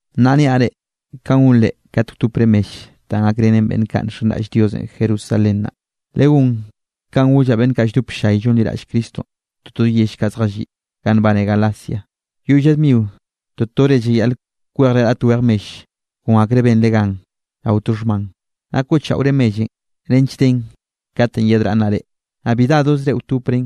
Nnaꞌ nniaꞌ reꞌ kanꞌ gonre kat wtopre mell danꞌ gakrenen beꞌnn kaꞌ nxenraꞌll Diosenꞌ Jerusalén naꞌ. Legón kanꞌ gollaꞌ beꞌnn kaꞌ lldop ll-llay llonliraꞌll Cristonꞌ toto yell kaꞌ zjalliꞌ ganꞌ nbane Galacia. Yoꞌy lla dmio to tore llayaꞌl kwejre raꞌt wej mell kon akre benre gan rao to xhman. Naꞌ koꞌchaꞌore mellenꞌ nench den katenꞌ yedraꞌnnaꞌ reꞌ, naꞌ bi dadozre wtopren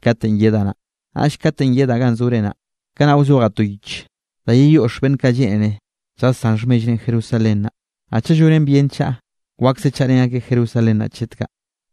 katenꞌ yedaꞌ naꞌ. Naꞌll katenꞌ yedaꞌ ganꞌ zore naꞌ, kanaꞌ wzojaꞌ to yich da yeyoꞌx beꞌnn kaꞌ lleꞌnere lljasán xhmellrenꞌ Jerusalén naꞌ. Naꞌ chaꞌ llonen bien chaꞌa, wakse chaꞌrén akeꞌ Jerusalén naꞌ chet kaꞌ.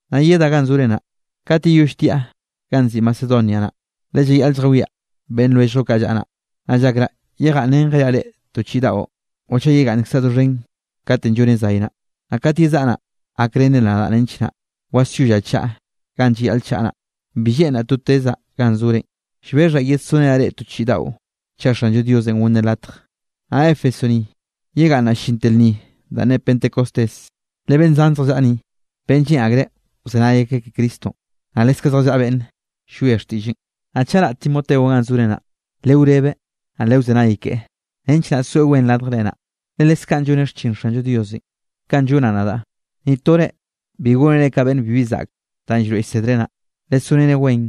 Naꞌ yedaꞌ ganꞌ zore naꞌ, kat yeyoll tiaꞌ ganꞌ nziꞌi Macedonia naꞌ, le llayaꞌl lljawiaꞌ beꞌnn lwelljllo kaꞌ llaꞌa naꞌ. Naꞌ llakraꞌ yegaꞌnnrenjeaꞌ reꞌ to chiꞌi daꞌo, o chaꞌ yegaꞌnnkzaꞌ doxhen katenꞌ llonen zay naꞌ, naꞌ kat yezaꞌa naꞌ, gakrenre nadaꞌ nench naꞌ wasyollaꞌ chaꞌa ganꞌ llayaꞌl chaꞌa naꞌ. Bi lleꞌnraꞌ to tezaꞌ ganꞌ zorenꞌ, llbexhaꞌ yedsorenaꞌ reꞌ to chiꞌi daꞌo chaꞌ Xanllo Diosenꞌ gonneꞌ latj. Naꞌ Éfeso ni yegaꞌnnaꞌ llinte lnni danꞌ ne Pentecostés. Le beꞌnn zan zjallaꞌa ni, beꞌnn lleꞌn akreꞌ wzenay akeꞌ ke Cristonꞌ, naꞌ leskaꞌ zjallaꞌa beꞌnn llwie xtiꞌlleꞌn. Naꞌ chaꞌ raꞌ Timoteonꞌ ganꞌ zore naꞌ, lewrebeꞌ naꞌ lewzenay keꞌe nench naꞌ soeꞌ wen radjre naꞌ, le leskaꞌn lloneꞌ xchin Xanllo Diosenꞌ, kanꞌ llonaꞌ nadaꞌ. Ni tore bi gónereꞌ ka beꞌnn bibi zaꞌk danꞌ llroeꞌ llsedreꞌ naꞌ, lesoreneꞌ wen,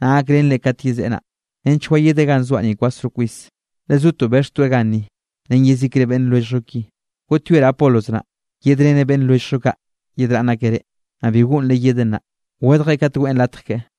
naꞌ gakrenreꞌ kat yezeꞌe naꞌ, nench wayedeꞌ ganꞌ zoaꞌ ni kwasro kwis, le zotoꞌ bexhtoeꞌ ganni ren yezikre beꞌnn lwelljllo ki. Goꞌtyoeraꞌ Apolos naꞌ, yedreneꞌ beꞌnn lwelljllo kaꞌ yedraꞌnn akeꞌ reꞌ, naꞌ bi goꞌnreꞌ yedeꞌ nnaꞌ, wedjeꞌ kat weꞌn latj keꞌe.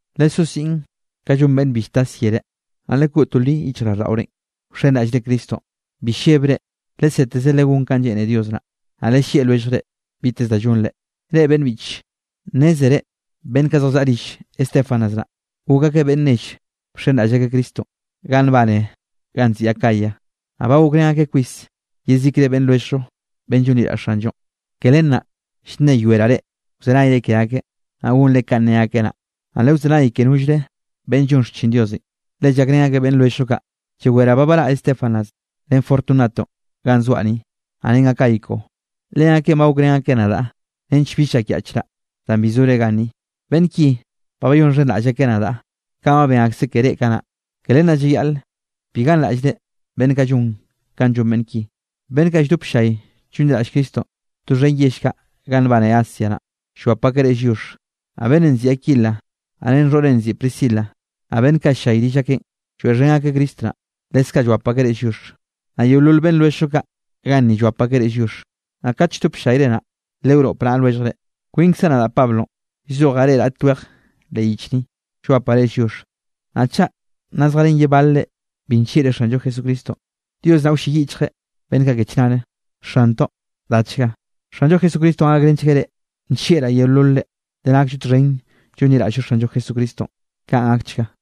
Lesó siꞌn ka llon beꞌnn bi lltas yere, naꞌ lekoꞌ to li yichjraꞌlldaꞌorenꞌ wxenraꞌllre Cristonꞌ. Bi llebre, leseteze legón kanꞌ lleꞌne Dios naꞌ. Naꞌ lellieꞌ lwelljre biteze da llonre. Reꞌ beꞌnn biꞌche, nnézere beꞌnn kaꞌ zjallaꞌa rill Estéfanas naꞌ, gok akeꞌ beꞌnn nell bxenraꞌll akeꞌ Cristonꞌ ganꞌ nbane ganꞌ nziꞌi Acaya, naꞌ ba gokrén akeꞌ kwis yezikre beꞌnn lwelljllo beꞌnn llonliraꞌll Xanllonꞌ. Ke len naꞌ llnneyoeraꞌ reꞌ wzenayre ke akeꞌ, naꞌ gonre kanꞌ ne akeꞌ naꞌ, naꞌ lewzenay ke nollre beꞌnn llon xchin Dios, le llakrén akeꞌ beꞌnn lwelljllo kaꞌ. Llaweraꞌ ba baraꞌ Estéfanas ren Fortunato ganꞌ zoaꞌ ni, naꞌ ren Acaico. Leakeꞌn ba gokrén akeꞌ nadaꞌ nench bill llakyaꞌchraꞌ danꞌ bi zore ganni. Beꞌnn ki ba bayonxhenraꞌll akeꞌ nadaꞌ kanꞌ ba ben akseꞌ ke reꞌ kanaꞌ, ke len naꞌ llayaꞌl bi ganraꞌllre beꞌnn kaꞌ llon kanꞌ llon beꞌnn ki. Beꞌnn kaꞌ lldop ll-llay llonliraꞌll Cristonꞌ doxhen yell kaꞌ ganꞌ nbaneꞌ Asia naꞌ, llwap akeꞌ reꞌ lliox. Naꞌ beꞌnnenꞌ nziꞌi Aquila, naꞌ ren xhoꞌreꞌn nziꞌi Priscila, naꞌ beꞌnn kaꞌ ll-llay rill akeꞌn lloeꞌxhen akeꞌ Cristo naꞌ, leskaꞌ llwap akeꞌ reꞌ lliox. Naꞌ yeolol beꞌnn lwelljllo kaꞌ ganni llwap akeꞌ reꞌ lliox. Naꞌ kat lldop ll-llayre naꞌ, lewnoꞌp naꞌa lwelljre. Kwinkzaꞌ nadaꞌ Pablo llzojaꞌ reꞌ raꞌt weje leꞌ yich ni, llwapaꞌ reꞌ lliox. Naꞌ chaꞌ nna zjarén ye balre bi nllieꞌreꞌ Xanllo Jesucristonꞌ, Dios naꞌ wlleyiꞌchgueꞌ beꞌnn kaꞌ ke chnare. Xantoꞌ, dachga. Xanllo Jesucristonꞌ gakrenchgueꞌ reꞌ. Nllieꞌraꞌ yeololre le nakllo txhen llonliraꞌll-llo Xanllo Jesucristonꞌ. Kaꞌn gakchga.